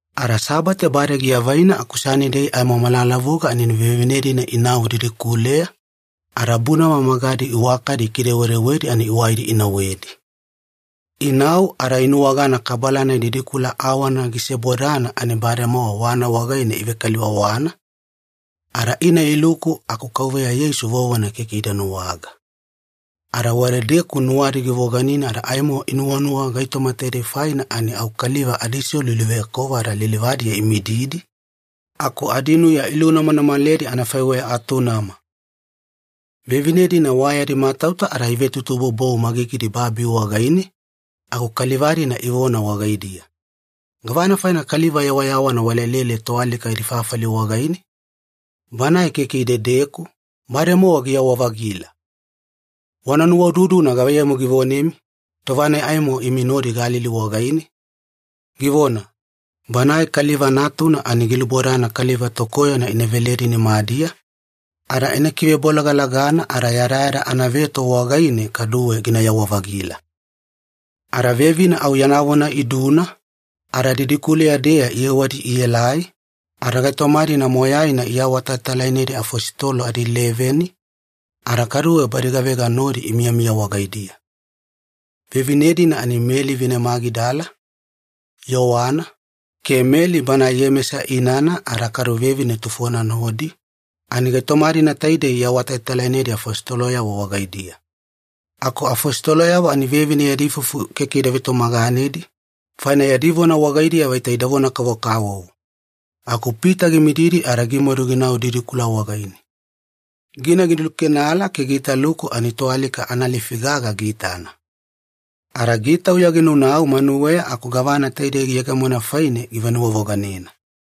Ada Sabate bade giavaina aku Sanidei aimo malalavuga ani vevine-dina inau didikuleya, ada bunama magadi iwakadi ikidewedewedi ani iwaidi inauwedi. Inau ada inuwagana kabala-nai didikula awana gisebodana ani bademowa wana wagaine ivekaliwawana, ada ina iluku aku Kauveya Yeisu vovona keke ida nuwaga. Ada wadedeku nuwadi givoganina ada aimo inuwanuwa gaitoma taidei faina ani au kaliva adiselu iluveyakova ada lilivadiya imididi, aku adinuya ilunamanamaledi anafaiweya atunama. Vevine-dina wa yadi matauta ada ivetutuboubou magigidi babi wagaine, aku kaliva-dina ivona wagaidiya, “Gavana faina kaliva yawayawana walelele toalika yadi fafali wagaine? Banae keke idedeku, bademowa giyawa-vagila! Wana nuwaududuna gavaiyamu givonemi, tova-nai aimo imi nodi Galili wagaine, givona, ‘Banae Kaliva Natuna ani gilubodana kaliva tokoyona ina veledi nimadiya, ada ina kivebolagalagana ada yadayada anaveto wagaine kaduwe ginayawa-vagila.’” Ada vevine au yana vona iduna, ada didikuleya-deya iyewadi ielai, ada gaitoma-dina moyaina iawatalatalainedi afositolo adileveni, ada kaduwe badi gavega nodi imiyamiya wagaidiya. Vevine-dina ani Meli vine Magidala, Yowana, ke Meli banae Iyemesa inana ada kadu vevine tufona nodi, ani gaitoma-dina taidei iawatalatalainedi afositoloyavo wagaidiya. Aku afositoloyavo ani vevine yadi ifufu keke ida vetumaganedi, faina yadi vona wagaidiya vaita idavona-kavokavovo. Aku Pita gimididi ada gimadu ginau didikula wagaine. Gina gilukenala ke giitaluku ani toalika analifi gaga giitana. Ada gitauya ginaunau manuweya aku gavana taidei giyegemona faine givenuwavoganena.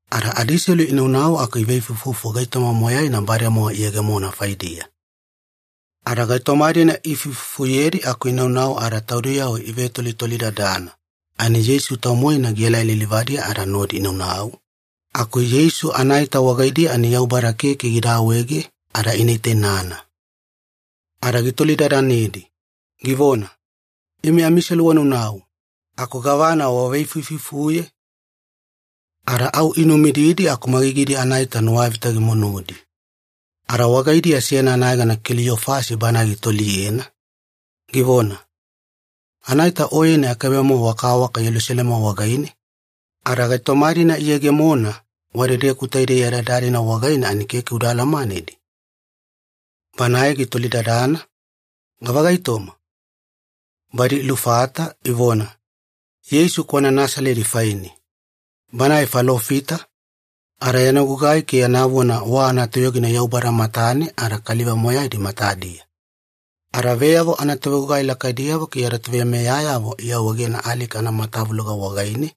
Ada adiselu inaunau aku iveifuifufu gaitoma moyaina bademowa iyegemona faidiya. Ada gaitoma-dina ifuifufuyedi aku inaunau ada taudiyavo ivetolitolidadana, ani Yeisu tau-moena gielai lilivadiya ada nodi inaunau, aku Yeisu anaita wagaidiya ani Yaubada keke gida awaege ada ina itainana. Ada gitolidadanedi, givona, “Imi amiselu wanaunau, aku gavana waveifuifufuye?” Ada au inumididi aku magigidi anaita nuwavita gimunudi. Ada wagaidiya seyana anayegana Keliyofasi banae gitoliyena, givona, “Anaita Oyeni akaibe-mowa wakawaka Yelusalema wagaine, ada gaitoma-dina iyegemona wadedeku taidei yadayada-dina wagaine ani keke uda alamanedi?” Banae gitolidadana, “Gava gaitoma?” Badi ilufata, ivona, “Yeisu kwana Nasaledi faine. Banae falofita, ada yana gugai ke yana vona wa anatoyogina Yaubada matane ada kaliva moyaidi matadiya. Ada veyavo anatovegugai lakaidiyavo ke yada toveimeyayavo iawaegena alika anamatavuloga wagaine,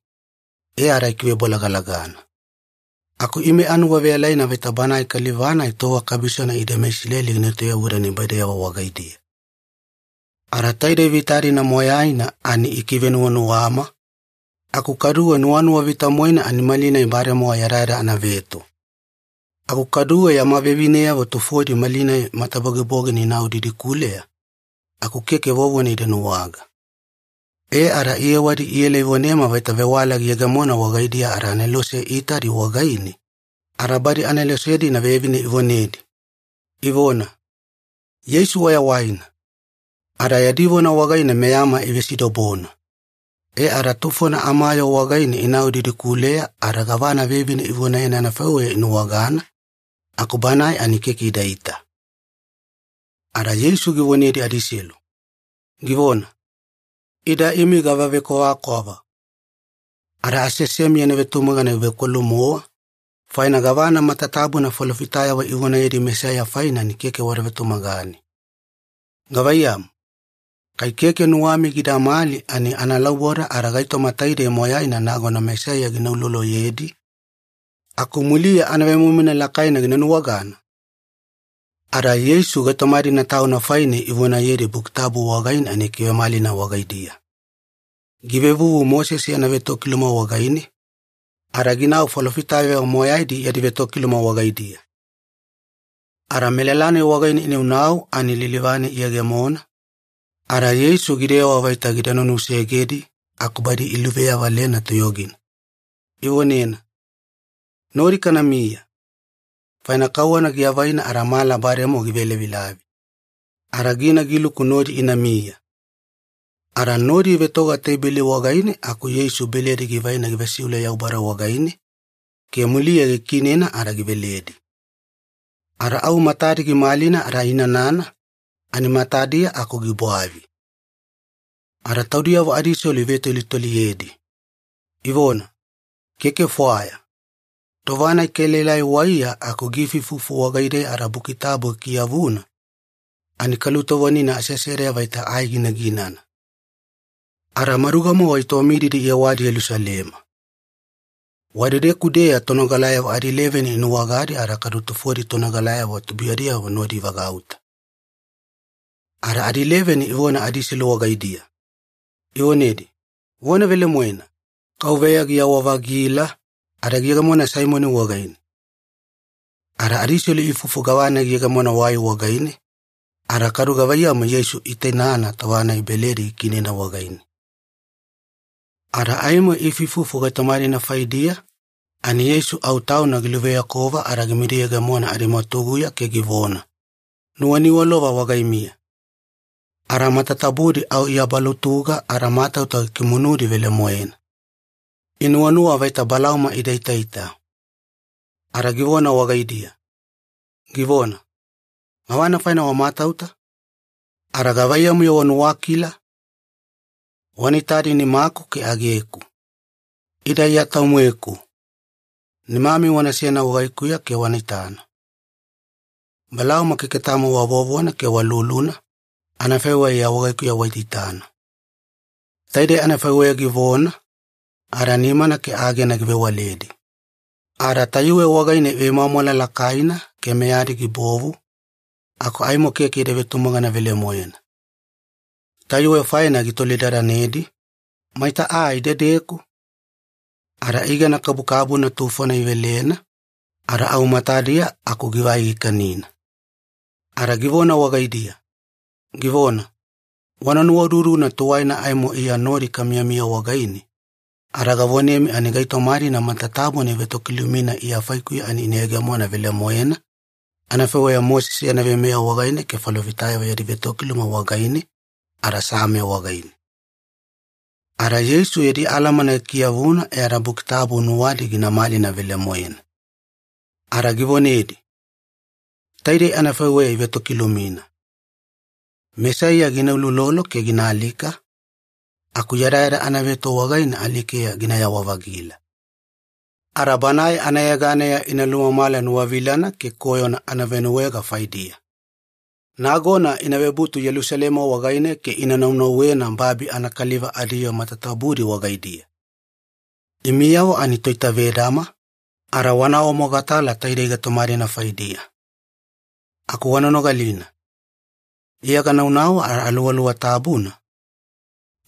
e ada ikivebolagalagana. Aku ime anuwaveyalaina vaita Banae Kaliva-nai tova kabisona ide meIsileli gina etoyavuda nibaideyavo wagaidiya. Ada taidei vita-dina moyaina ani ikivenuwanuwama, aku kaduwe nuwanuwa vita-moena ani malinai bademowa yadayada anaveto. Aku kaduwe yama vevineyavo tufodi malinai matabogibogina inau didikuleya, aku keke vovona ida nuwaga. E ada iyewadi iela ivonema vaita vewala giyegemona wagaidiya ada anelose iitadi wagaine, ada badi anelose-dina vevine ivonedi, ivona, ‘Yeisu wayawaina!’ Ada yadi vona wagaine meyama ivesidobona. E ada tufona amayoo wagaine inau didikuleya ada gavana vevine ivonayena anafaiweya inuwagana, aku Banae ani keke idaita.” Ada Yeisu givonedi adiselu, givona, “Ida imi gava vekwavakwava. Ada aseasemi yana vetumagana givekwalu-mowa, faina gavana matatabuna falofitayavo ivonayedi Mesaiya faine ani keke wada vetumagane. Gavaiyamu, kai keke nuwami gidamali ani analauboda ada gaitoma taidei moyaina nagona Mesaiya gina uloloyedi, aku muliya anavemoimoina lakaina gina nuwagana?” Ada Yeisu gaitoma-dina Tauna faine ivonayedi Buki Tabu wagaine ani gikivemalina wagaidiya. Givevuvu Mosese yana vetokiluma wagaine, ada ginau falofitayavo moyaidi yadi vetokiluma wagaidiya. Ada melala-nai wagaine inaunau ani lilivane iyegemona, ada Yeisu gidewa vaita gida nunusegedi aku badi iluveyavalena toyogina, ivonena, “Nodi kanamiya, faina kauwana giavaina ada mala bademowa givelavilavi.” Ada gina giluku nodi inamiya. Ada nodi ivetoga teibeli wagaine aku Yeisu beledi givaina givesiule Yaubada wagaine, ke muliya gikiinena ada giveledi. Ada au matadi gimalina ada iinanana, ani matadiya aku gibwavi. Ada taudiyavo adiselu ivetolitoliyedi, ivona, “Keke fwaya, tova-nai kaelaelai waiya aku giifuifufu wagaideya ada Buki Tabu gikiyavuna, ani kalutovonina aseasedeya vaita ai ginaginana.” Ada maduga-mowa itowamididi iyewadi Yelusalema. Wadedeku-deya tonogalayavo adileveni inuwagadi ada kadu tufodi tonogalayavo tubuiyadiyavo nodi ivagauta. Ada adileveni ivona adiselu wagaidiya, ivonedi, “Vona velemoena! Kauveya giyawa-vagila, ada giyegemona Saimoni wagaine.” Ada adiselu iifufu gavana giyegemona wai wagaine, ada kadu gavaiyamu Yeisu iitainana tova-nai beledi gikiinena wagaine. Ada aimo iifuifufu gaitoma-dina faidiya, ani Yeisu au Tauna giluveyakova ada gimidiyegemona adimwatuguya ke givona, “Nuwaniwalova wagaimiya.” Ada matatabudi au iabalutuga ada matauta gikimunudi velemoena. Inuwanuwa vaita balauma ida itaita. Ada givona wagaidiya, givona, “Gavana faina wamatauta? Ada gavaiyamu-yo wanuwakila? Wana itadi nimaku ke ageku. Ida Iya tau-moeku. Nimami wanasena wagaikuya ke wana itana. Balauma keke tamo wa vovona ke wa luluna, anafaiweya Iya wagaikuya waitaitana.” Taidei anafaiweya givona, ada nimana ke agena givewaledi. Ada tayuwe wagaine ivemwamwala lakaina ke meyadi gibovu, aku aimo keke ida vetumagana velemoena. Tayuwe faina gitolidadanedi, “Maita aa idedeku?” Ada igana kabukabuna tufona ivelena, ada au matadiya aku givai gikanina. Ada givona wagaidiya, givona, “Wana nuwaududuna tuwaina aimo Iya nodi kamiyamiya wagaine, ada gavonemi ani gaitoma-dina matatabuna ivetokilumina Iya faikuya ani ina yegemona velemoena, anafaiweya Mosese yana veimeya wagaine ke falofitayavo yadi vetokiluma wagaine, ada Same wagaine.” Ada Yeisu yadi alamana gikiyavuna e ada Buki Tabu nuwadi gina malina velemoena. Ada givonedi, “Taidei anafaiweya ivetokilumina. Mesaiya gina uloulolo ke gina alika, aku yadayada anaveto wagaine alikeya ginayawa-vagila. Ada Banae anayeganeya ina lumamala nuwavilana ke koyona anavenuwaega faidiya. Nagona ina vebutu Yelusalema wagaine ke ina naunauwena babi anakaliva adiyoo matatabudi wagaidiya. Imiyavo ani toitavedama, ada wana awamogatala taidei gaitoma-dina faidiya. Aku wana nogalina, Iya gananau ada Aluwaluwa Tabuna,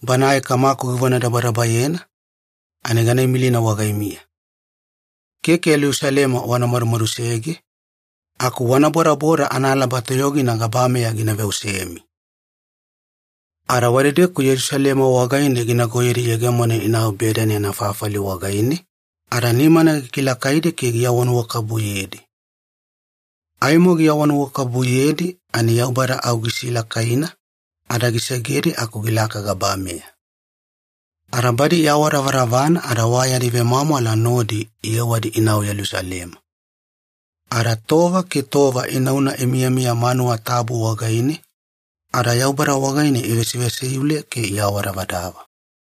Banae Kamaku givonadabadabayena, ani gana imilina wagaimiya. Keke Yelusalema wana madumadusege, aku wana bodaboda analaba toyogina gabameya gina veosemi.” Ada wadedeku Yelusalema wagaine ginagoyedi iyegemona inau Bedani anafafali wagaine, ada nimana gikilakaidi ke giawanuwakabubuyedi. Aimo giawanuwakabubuyedi ani Yaubada au gisilakaina, ada gisegedi aku gilaka gabameya. Ada badi iawadavadavana ada wa yadi vemwamwala nodi iyewadi inau Yelusalema. Ada tova ke tova inauna imiyamiya manuwa tabu wagaine, ada Yaubada wagaine ivesivesiule ke iawadavadava.